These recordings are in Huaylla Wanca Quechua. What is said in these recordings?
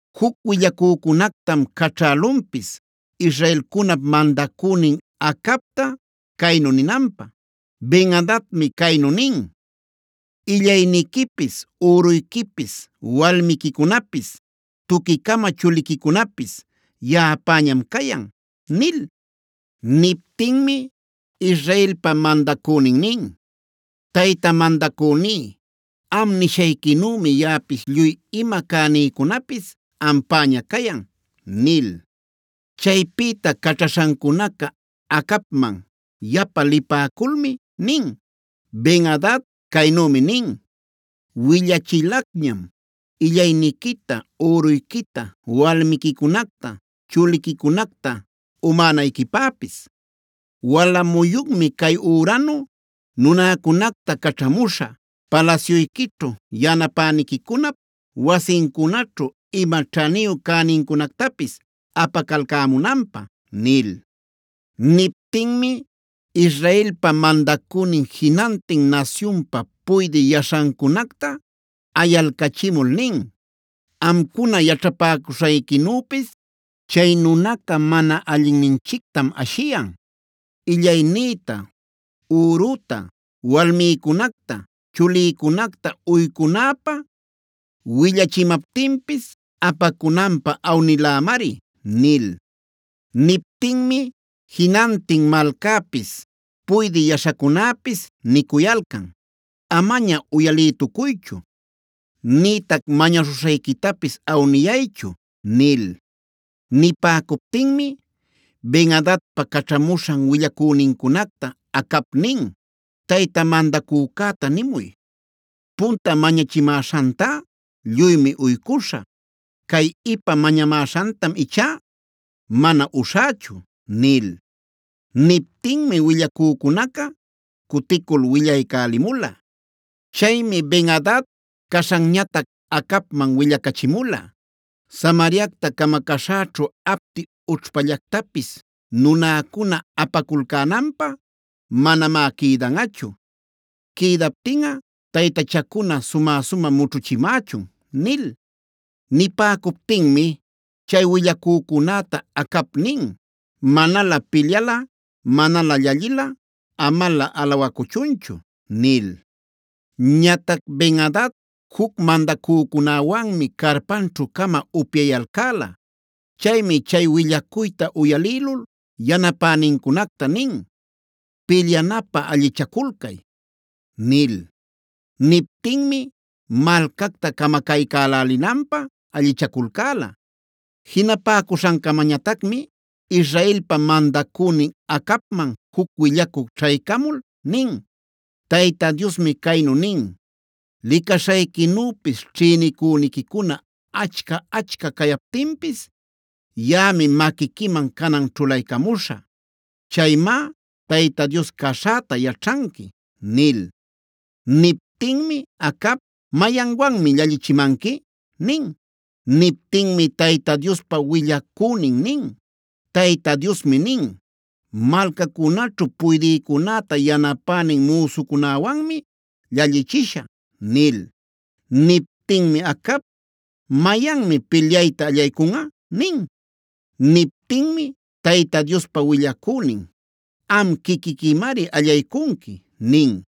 Juc willacücunactam caćhälunpis israelcunap mandacünin Acabta caynu ninanpä: “Ben-adadmi caynu nin: ‘Illayniquipis üruyquipis, walmiquicunapis, tuqui-cama chuliquicunapis yaꞌapäñam cayan’” nil. Niptinmi Israelpa mandacünin nin: “Tayta mandacüní, am nishayquinümi yaꞌapis lluy ima cänïcunapis ampäña cayan” nil. Chaypïta caćhaśhancunaca Acabman yapa lipäculmi nin: “Ben-adad caynümi nin: ‘Willachilacñam illayniquita, üruyquita, walmiquicunacta, chuliquicunacta umänayquipäpis. Wala muyunmi cay üranu nunäcunacta caćhamuśhä palasyuyquićhu, yanapäniquicunap wasincunaćhu ima ćhaniyu cänincunactapis apacalcämunanpä’” nil. Niptinmi Israelpa mandacünin jinantin nasyunpa puydï yaśhancunacta ayalcachimul nin: “Amcuna yaćhapäcuśhayquinüpis chay nunaca mana allinninchictam ashiyan; illaynïta, üruta, walmïcunacta, chulïcunacta uycunäpä willachimaptinpis apacunanpä awnilämari” nil. Niptinmi jinantin malcäpis, puydï yaśhacunäpis nicuyalcan: “Amaña uyalïtucuychu; nïtac mañaśhuśhayquitapis awniyayñachu” nil. Nipäcuptinmi Ben-adadpa caćhamuśhan willacünincunacta Acab nin: “Tayta mandacücäta nimuy: ‘Punta mañachimäśhantá lluymi uycuśhä. Cay ipa mañamäśhantam ichá mana uśhächu’” nil. Niptinmi willacücunaca cuticul willaycälimula. Chaymi Ben-adad caśhanñatac Acabman willacachimula: “Samariacta camacaśhäćhu apti ućhpallactapis nunäcuna apaculcänanpä manamá quïdanꞌachu. Quïdaptinꞌa taytachacuna sumä-sumä mućhuchimächun” nil. Nipäcuptinmi chay willacücunäta Acab nin: “Manalä pilyalꞌa, manalä llallilꞌa amalä alawacuchunchu” nil. Ñatac Ben-adad juc mandacücunäwanmi carpanćhu-cama upyayalcäla. Chaymi chay willacuyta uyalïlul yanapänincunacta nin: “Pilyanapä allichaculcay” nil. Niptinmi malcacta camacaycälälinanpä allichaculcäla. Jinapäcuśhancamañatacmi Israelpa mandacünin Acabman juc willacü ćhaycamul nin: “Tayta Diosmi caynu nin: ‘Licaśhayquinüpis ćhïnicüniquicuna achca-achca cayaptinpis, yaꞌami maquiquiman canan ćhulaycamuśhä. Chaymá Tayta Dios caśhäta yaćhanqui’” nil. Niptinmi Acab: “¿Mayanwanmi llallichimanqui?” nin. Niptinmi Tayta Diospa willacünin nin: “Tayta Diosmi nin: ‘Malcacunaćhu puydïcunäta yanapänin müsucunawanmi llallichishä’” nil. Niptinmi Acab: “¿Mayanmi pilyayta allaycunꞌa?” nin. Niptinmi Tayta Diospa willacünin: “Am quiquiquimari allaycunqui” nin.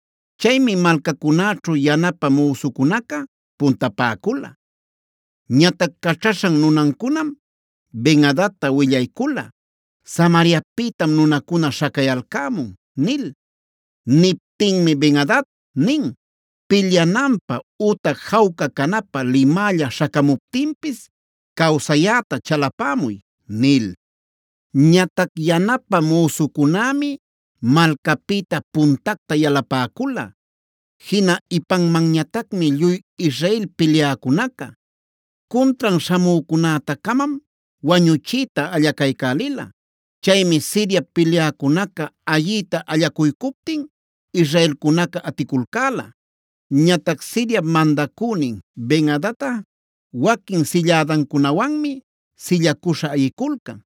Chaymi malcacunäćhu yanapä müsucunaca puntapäcula. Ñatac caćhaśhan nunancunam Ben-adadta willaycula: “Samariapïtam nunacuna śhacayalcämun” nil. Niptinmi Ben-adad nin: “Pilyananpä ütac jawca canapä limälla śhacamuptinpis cawsayäta chalapämuy” nil. Ñatac yanapä müsucunämi malcapïta puntacta yalapäcula, jina ipanmanñatacmi lluy Israel pilyäcunaca. Cuntran śhamücunäta-camam wañuchiyta allacaycälila. Chaymi Siriap pilyäcunaca ayiyta allacuycuptin israelcunaca aticulcäla. Ñatac Siriap mandacünin Ben-adadꞌa waquin sillädancunawanmi sillacuśha ayiculcan.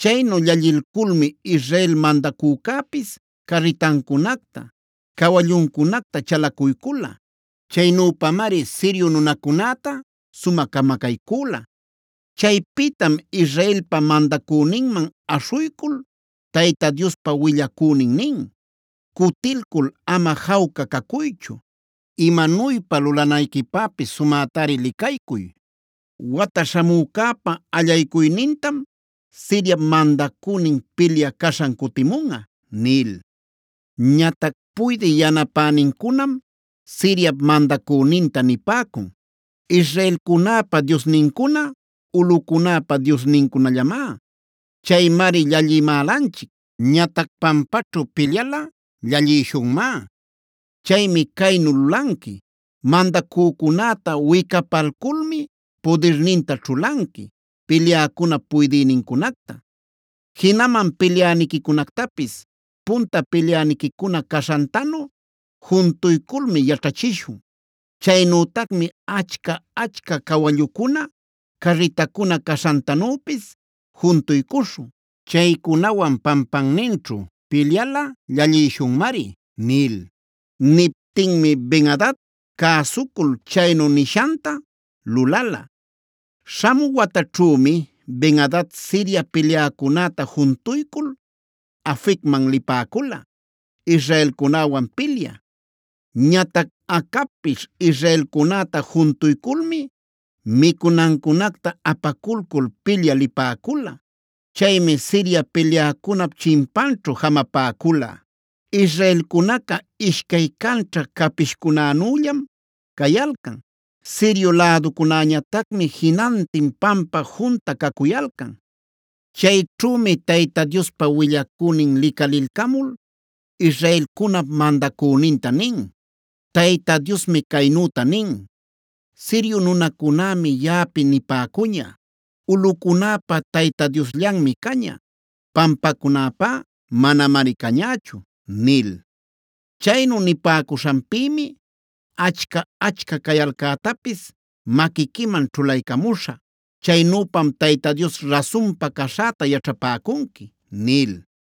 Chaynu llallilculmi Israel mandacücäpis carritancunacta, cawalluncunacta chalacuycula. Chaynüpamari Sirio nunacunäta sumä camacaycüla. Chaypïtam Israelpa mandacüninman aśhuycul Tayta Diospa willacünin nin: “Cutilcul ama jawca cacuychu. Imanuypa lulanayquipäpis sumätari licaycuy. Wata śhamücäpa allaycuynintama Siriap mandacünin pilyä caśhan cutimunꞌa” nil. Ñatac puydï yanapänincunam Siriap mandacüninta nipäcun: “Israelcunäpa diosnincuna ulꞌucunäpa diosnincunallamá. Chaymari llallïmälanchic. Ñatac pampaćhu pilyalꞌa llallïshunmá. Chaymi caynu lulanqui: mandacücunäta wicapalculmi pudirninta ćhulanqui pilyäcunap puydïnincunacta. Jinaman pilyäniquicunactapis punta pilyäniquicuna caśhantanu juntuyculmi yaćhachishun. Chaynütacmi achca-achca cawallucuna, carritacuna caśhantanüpis juntuycuśhun. Chaycunawan pampanninćhu pilyalꞌa llallïshunmari” nil. Niptinmi Bed-adad cäsucul chaynu nishanta lulala. Śhamü wataćhümi Ben-adad Siria pilyäcunäta juntuycul Afecman lipäcula israelcunäwan pilyä. Ñatac Acabpis israelcunäta juntuyculmi micunancunacta apaculcul pilyä lipäcula. Chaymi Siria pilyäcunap chimpanćhu jamapäcula. Israelcunaca ishcay canćha capishcunänüllam cayalcan; Sirio läducunäñatacmi jinantin pampa junta cacuyalcan. Chayćhümi Tayta Diospa willacünin licalilcamul israelcunap mandacüninta nin: “Tayta Diosmi caynüta nin: ‘Sirio nunacunämi yaꞌapi nipäcuña: “Ulꞌucunäpa Tayta Diosllanmi caña; pampacunäpá manamari cañächu” nil. Chaynu nipäcuśhanpïmi achca-achca cayalcätapis maquiquiman ćhulaycamuśhä. Chaynüpam Tayta Dios rasunpa caśhäta yaćhapäcunqui’” nil.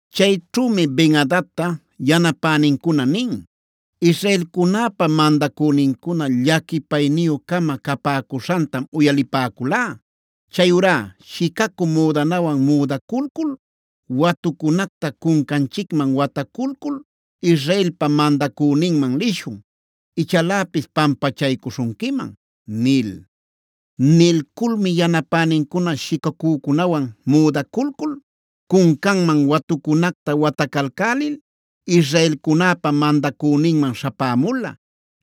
Chayćhümi Ben-adadta yanapänincuna nin: “Israelcunäpa mandacünincuna llaquipayniyü-cama capäcuśhantam uyalipäculá. Chayurá shicacü müdanawan müdaculcul, watucunacta cuncanchicman wataculcul Israelpa mandacüninman lishun, ichaläpis pampachaycuśhunquiman” nil. Nilculmi yanapänincuna shicacücunawan müdaculcul, cuncanman watucunacta watacalcälil israelcunäpa mandacüninman śhapämula.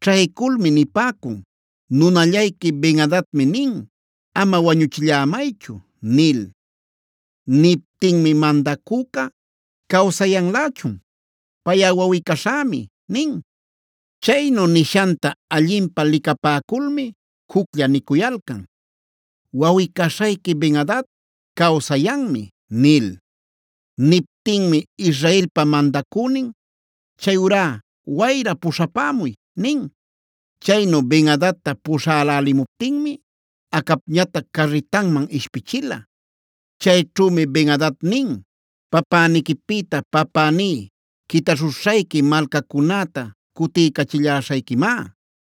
Ćhayculmi nipäcun: “Nunallayqui Ben-adadmi nin: ‘Ama wañuchillämaychu’” nil. Niptinmi mandacüca: “¿Cawsayanlächun? Payꞌa wawꞌi-caśhämi” nin. Chaynu nishanta allinpä licapäculmi juclla nicuyalcan: “Wawꞌi-caśhayqui Ben-adad cawsayanmi” nil. Niptinmi Israelpa mandacünin: “Chayurá ¡wayra puśhapämuy!” nin. Chaynu Ben-adadta puśhälälimuptinmi Acabñatac carritanman ishpichila. Chayćhümi Ben-adad nin: “Papäniquipïta papäní quitaśhuśhayqui malcacunäta cutiycachilläśhayquimá.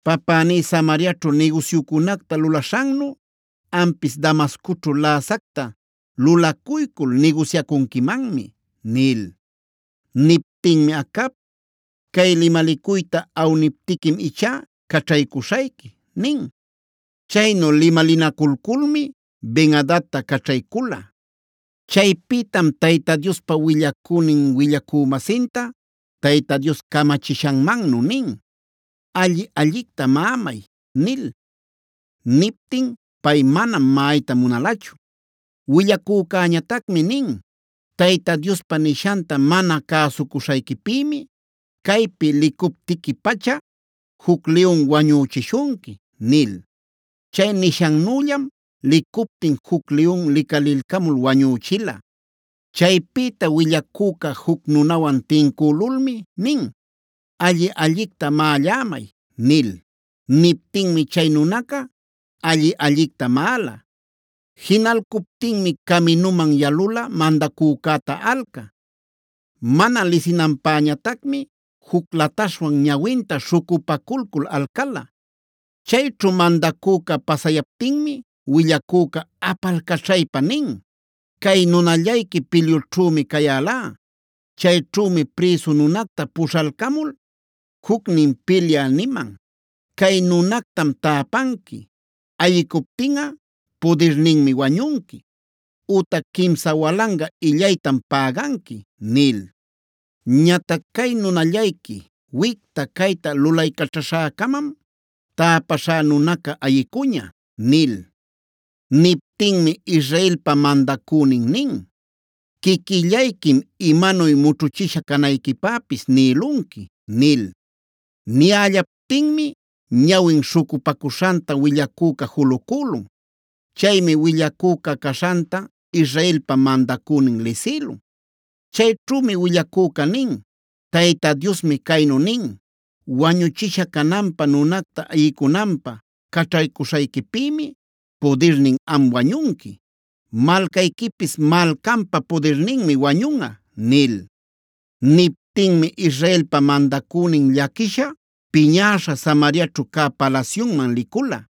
Papäní Samariaćhu nigusyucunacta lulaśhannu ampis Damascoćhu läsacta lulacuycul nigusyacunquimanmi” nil. Niptinmi Acab: “Cay limalicuyta awniptiquim ichá caćhaycuśhayqui” nin. Chaynu limalinaculculmi Ben-adadta caćhaycula. Chaypïtam Tayta Diospa willacünin willacü-masinta Tayta Dios camachishanmannu nin: “Alli-allicta maꞌamay” nil. Niptin pay manam maꞌayta munalachu. Willacücäñatacmi nin: “Tayta Diospa nishanta mana cäsucuśhayquipïmi caypi licuptiqui-pacha juc liyun wañüchishunqui” nil. Chay nishannüllam licuptin juc liyun licalilcamul wañüchila. Chaypïta willacüca juc nunawan tincülulmi nin: “Alli-allicta maꞌallämay” nil. Niptinmi chay nunaca alli-allicta maꞌala. Jinalcuptinmi caminuman yalula mandacücäta alcä. Mana lisinanpäñatacmi juc lataśhwan ñawinta śhucupaculcul alcala. Chayćhu mandacüca pasayaptinmi willacüca apalcaćhaypa nin: “Cay nunallayqui pilyućhümi cayälá. Chayćhümi prïsu nunacta puśhalcamul jucnin pilyä niman: ‘Cay nunactam täpanqui. Ayicuptinꞌa pudirninmi wañunqui; ütac quimsa walanga illaytam päganqui’ nil. Ñatac cay nunallayqui wicta-cayta lulaycaćhaśhäcamam täpäśhá nunaca ayicuña” nil. Niptinmi Israelpa mandacünin nin: “Quiquillayquim imanuy mućhuchisha canayquipäpis nïlunqui” nil. Niyällaptinmi ñawin śhucupacuśhanta willacüca julucülun. Chaymi willacüca caśhanta Israelpa mandacünin lisïlun. Chayćhümi willacüca nin: “Tayta Diosmi caynu nin: ‘Wañuchisha cananpä nunacta ayicunanpä caćhaycuśhayquipïmi pudirnin am wañunqui. Malcayquipis malcanpa pudirninmi wañunꞌa’” nil. Niptinmi Israelpa mandacünin llaquisha, piñäśha Samariaćhu cä palasyunman licula.